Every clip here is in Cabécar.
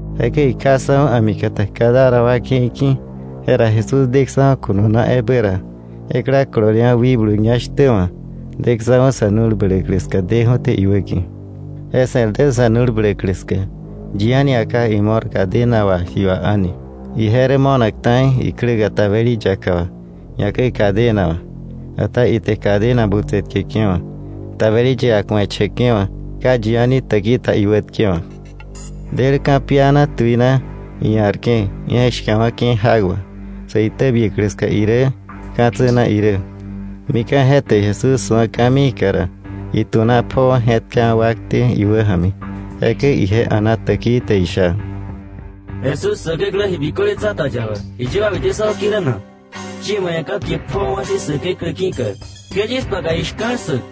Jekäi ikjaksa̱julu a̱mikata Gadara wa ke̱i ki̱. Jera Jesús deksa̱ju̱ ko̱no na ebä ra, ekla kololewa̱ wikblu ñá shtä wa̱ daksa̱ju̱ sa̱ nu̱l bläklä ska deju̱té iwäki̱. Je se̱r dä sa̱ nu̱l bläklä ska. Yi a̱ni ia̱ ka imo̱r, cadena wà ji wà a̱ni. Ije rä mo̱nak ta̱i ikläka tabeli yaka wà, ñakäi cadena wà, ata ite cadena butse tkeke̱wa̱, tabeli yaka ku̱eche̱ke̱wa̱. Ka yi a̱ni täki ta iwätkewa̱k. Del ka̱piana tuina, ia̱rke̱ ije̱k shka̱wa̱ke̱ jak wà, sä itäbiäklä ska irä, ka̱tsä na irä. Mika̱ je te Jesús su̱a ka̱miika ra, itu̱na pjoo je̱tkawa̱ wakte iwäja̱mi. Jekäi ije a̱na täkii te isha: —Jesús, Säkeklä Ji Biköle Tsa̱ta yaba, ¿jiye ba bite yis wäki̱ rä na? Yie ma ia̱ ka̱kie pjoowa̱ si̱ Säkeklä ki̱ka, ¡ke yis paka ji shka̱l ssäk!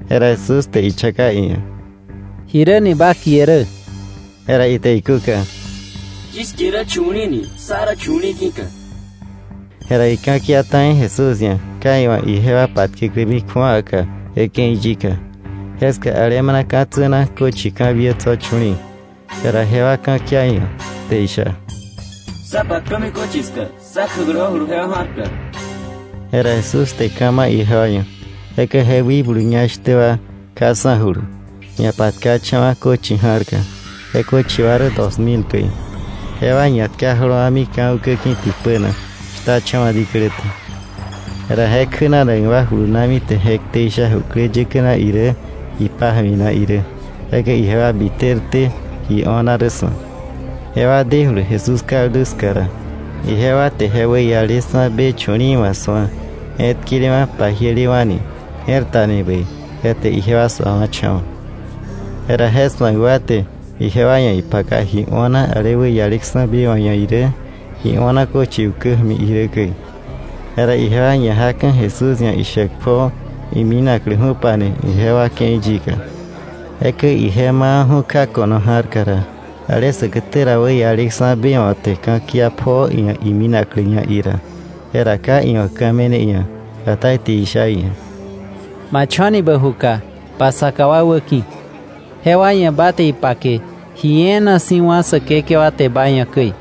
Jera Jesús te ichaka iia̱: —¿Jiräni ba kie rä? Jera ite ikúka: —Yis kie rä chu̱li̱i̱ ni, sá rä chu̱li̱i̱ ki̱ka. Jera ika̱kia ta̱i Jesús ia̱, ka iwa̱ ijewa patkäklämi kju̱awaka je ke̱i yika. Jeska alemana ka̱tsä na köchi ka̱biä tso̱ chu̱li̱i̱. Jera jewa ka̱kia iia̱ te isha: —Sá patkömi köchi ska, sá kjäkläwa̱julu jewa ja̱rka. Jera Jesús te ka̱ ma̱ ijewa ia̱. Jekäi je wikblu ñá shtä wa kjaksa̱julu, ñapatkacha̱wa̱ köchi ja̱rka. Je köchi wa rä dos mil käi. Jewa ñatka jolowa̱mi ka̱ ukä ki̱ tipä na, shtacha̱wa̱ diklä te. Jera je kjänanak wa julunami te je ktei sha jukläyäkä na irä ipája̱mi na irä. Jekäi ijewa biterté ji o̱na rä su̱ak. Jewa dejulu Jesús kaldu ska ra, ijewa te je wäialeksa̱ be chu̱li̱i̱ wa̱ su̱a je̱tkelewa̱, pajielewa̱ni, je̱r tani bäi; je te ijewa suawa̱cha̱wa̱. Jera je su̱ak wa te ijewa ia̱ ipaka ji o̱na ale wäialeksa̱ be wa̱ ia̱ irä, ji o̱na köchi ukä ja̱mi irä käi. Jera ijewa ñajaka̱ Jesús ia̱ ishäk pjoo iminakläju̱pani ijewa ke̱i yika. Jekäi ije mawa̱ju̱ kja ko̱no ja̱rka ra, ale säkätä ra wäialeksa̱ be wa̱ te ka̱kia pjoo iia̱ iminakläña ira. Jera ka iwa̱ ka̱ me̱ne iia̱, ata ite isha iia̱: —Ma cho̱ni bä juka ba saka wa wäki̱, jewa ia̱ ba te ipake ji e̱e̱na si̱ wá̱ Säkekewa te ma ia̱ käi,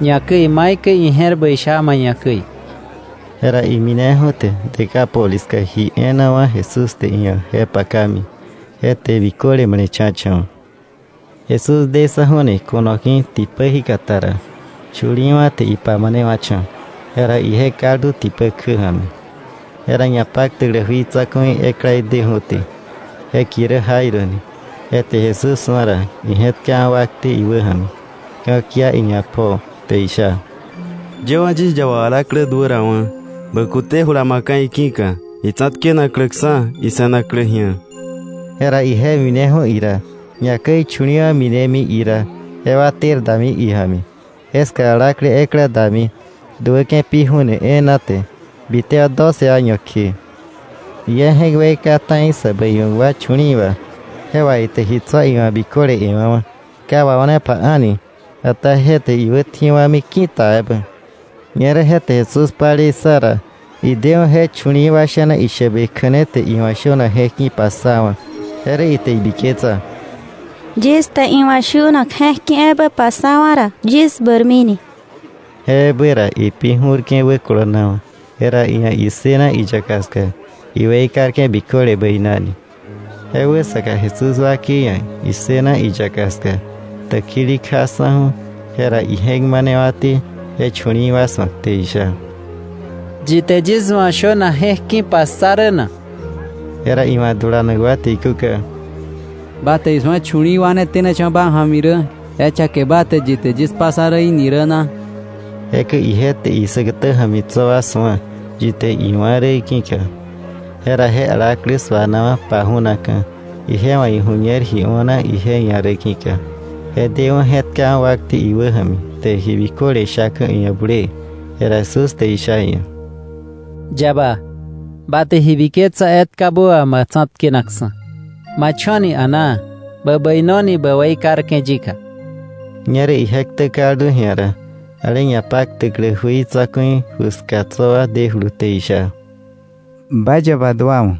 ñakäi maikäi ije̱r bäi sha ma ia̱ käi. Jera imineju̱ te Decápolis ska ji e̱e̱na wá̱ Jesús te iia̱ je pakami; je te biköle male̱cha̱cha̱wa̱. Jesús deksa̱ju̱ni ko̱no ki̱ tipä jíkata ra, chu̱li̱i̱wa̱ te ipamanewa̱cha̱. Jera ije kaldu tipä kjä ja̱mi. Jera ñapaktäklä jui tsa̱ku̱i ekla deju̱té, je kie rä Jairo ni. Je te Jesús su̱a ra, ije̱tkawa̱ wakte iwäja̱mi ka̱kia iia̱ pjoo te isha: —Yëwa̱ yis yaba alaklä duärawa̱. Bä kute jula ma̱kka̱ iki̱ka, itsa̱tkenakläksa̱, ise̱naklä ji̱a. Jera ije mineju̱ ira, ñakäi chu̱li̱i̱wa̱ minemi ira, jewa ter dami ija̱mi. Ñerä alaklä ekla duäke̱ pi ju̱ne e̱e̱na te, bitewa̱ doce año kje. Ije je̱k weika ta̱i sä bäiwa̱k wa chu̱li̱i̱ wà, je wà ite ji tso̱ iwa̱ biköle e̱wa̱wa̱, ka wao̱nepa a̱ni, ata je te iwätji̱wa̱mi ki̱ta ebä. Ñerä je te Jesús palei ssa ra, ideju̱ je chu̱li̱i̱ wa sha̱na ishäbe kja̱ne te iwa̱ shönak je̱k ki̱ passawa̱. Je rä ite ibiketsa: “Yis te iwa̱ shönak je̱k ki̱ ebä passawa̱ ra, yis bäirmini” ki̱ka. Je ebä ra ipi ju̱rke̱ wäkolonawa̱, jera iia̱ issëna iyaka ska iweikarke̱ biköle bäinani. Je wäsaka Jesús wakei ia̱ issëna iyaka ska täkili kjaksa̱ju̱. Jera ije̱k manewa̱té je chu̱li̱i̱ wa su̱ak te isha: —¿Yi te yis wa̱ shönak je̱k ki̱ passa rä na? Jera iwa̱ dulanak wa te ikúka: —Ba te isu̱a chu̱li̱i̱ wa ne tenacha̱wa̱ ma ja̱mi rä, ¿je chaké ba te: ‘Yi te yis passa rä í̱’ ni rä na? Jekäi ije te isäkätä ja̱mi tso̱ wa su̱a, yi te iwa̱ räí̱ ki̱ka. Jera je alaklä su̱anawa̱ paju̱naka̱, ije wa̱ iju̱ñer ji o̱na ije ia̱ rä ki̱ka, je deju̱ je̱tkawa̱ wakte iwäja̱mi te ji biköle shaka̱ iia̱ bulee. Jera Jesús te isha iia̱: —Yaba, ba te ji biketsa etkabä wà ma tsa̱tkenaksa̱. Ma cho̱ni a̱naa. Bä bäinoni bä weikarke̱ yika. Ñerä ije ktä kaldu ji̱a ra, ale ñapaktäklä jui tsa̱ku̱i ju ska tso̱ wa dejulu te isha: —Ba yaba duawa̱.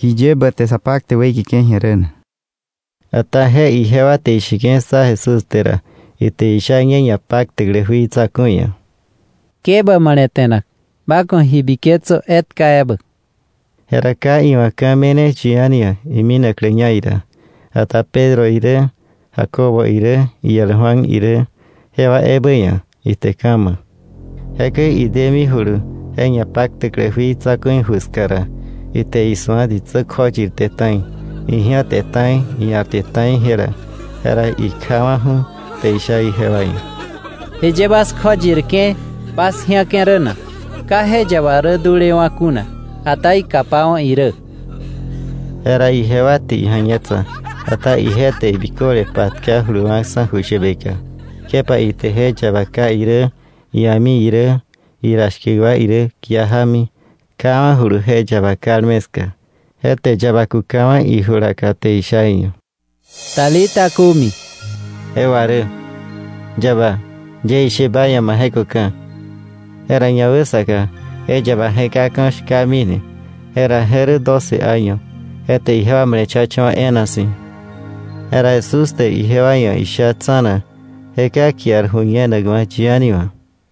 ¿Jiye bä te sa paktäk weikeke̱ ji̱a rä na? Ata je ijewa te isheke̱ ssa Jesús te ra, ite isha ñe ñapaktäklä jui tsa̱ku̱i ia̱: —Ke bä male̱te̱nak. Ba ku̱ ji biketsö etka ebä. Jera ka iwa̱ ka̱ me̱ne yi a̱ni ia̱ iminakläña ira, ata Pedro irä Jacobo irä iel Juan irä, jewa ebä ia̱ ite ka̱ ma̱. Jekäi idemijulu je ñapaktäklä jui tsa̱ku̱i ju ska ra, ite isu̱a ditsä kjoyirte ta̱i, iji̱ate ta̱i, ia̱rte ta̱i jela. Jera ikjawa̱ju̱ te isha ijewa ia̱: —¿Jiye bas kjoyirke̱, bas ji̱ake̱ rä na? Ka je yaba rä dulewa̱ kuna, ata ikapawa̱ irä. Jera ijewa te ija̱ñetsa. Ata ije te biköle patka juluwa̱ksa̱ ju shäbeka, kjepa ite je yaba ká irä, ia̱mi irä, ira shkä wa irä kia jámi, kjawa̱julu je yaba kalme ska. Je te yaba kukawa̱ ijulaka te isha iia̱: —Talita, cumi. (Je wà rä: “Yaba, yie ishe ba ia̱, ma je̱köka̱.”) Jera ñawäsaka je yaba je̱kaka̱ shkamini. Jera je rä doce año. Je te ijewa male̱cha̱cha̱wa̱ e̱e̱na si̱. Jera Jesús te ijewa ia̱ isha tsa̱na, je ka kiar ju̱ñenakwa̱ yi a̱ni wa̱.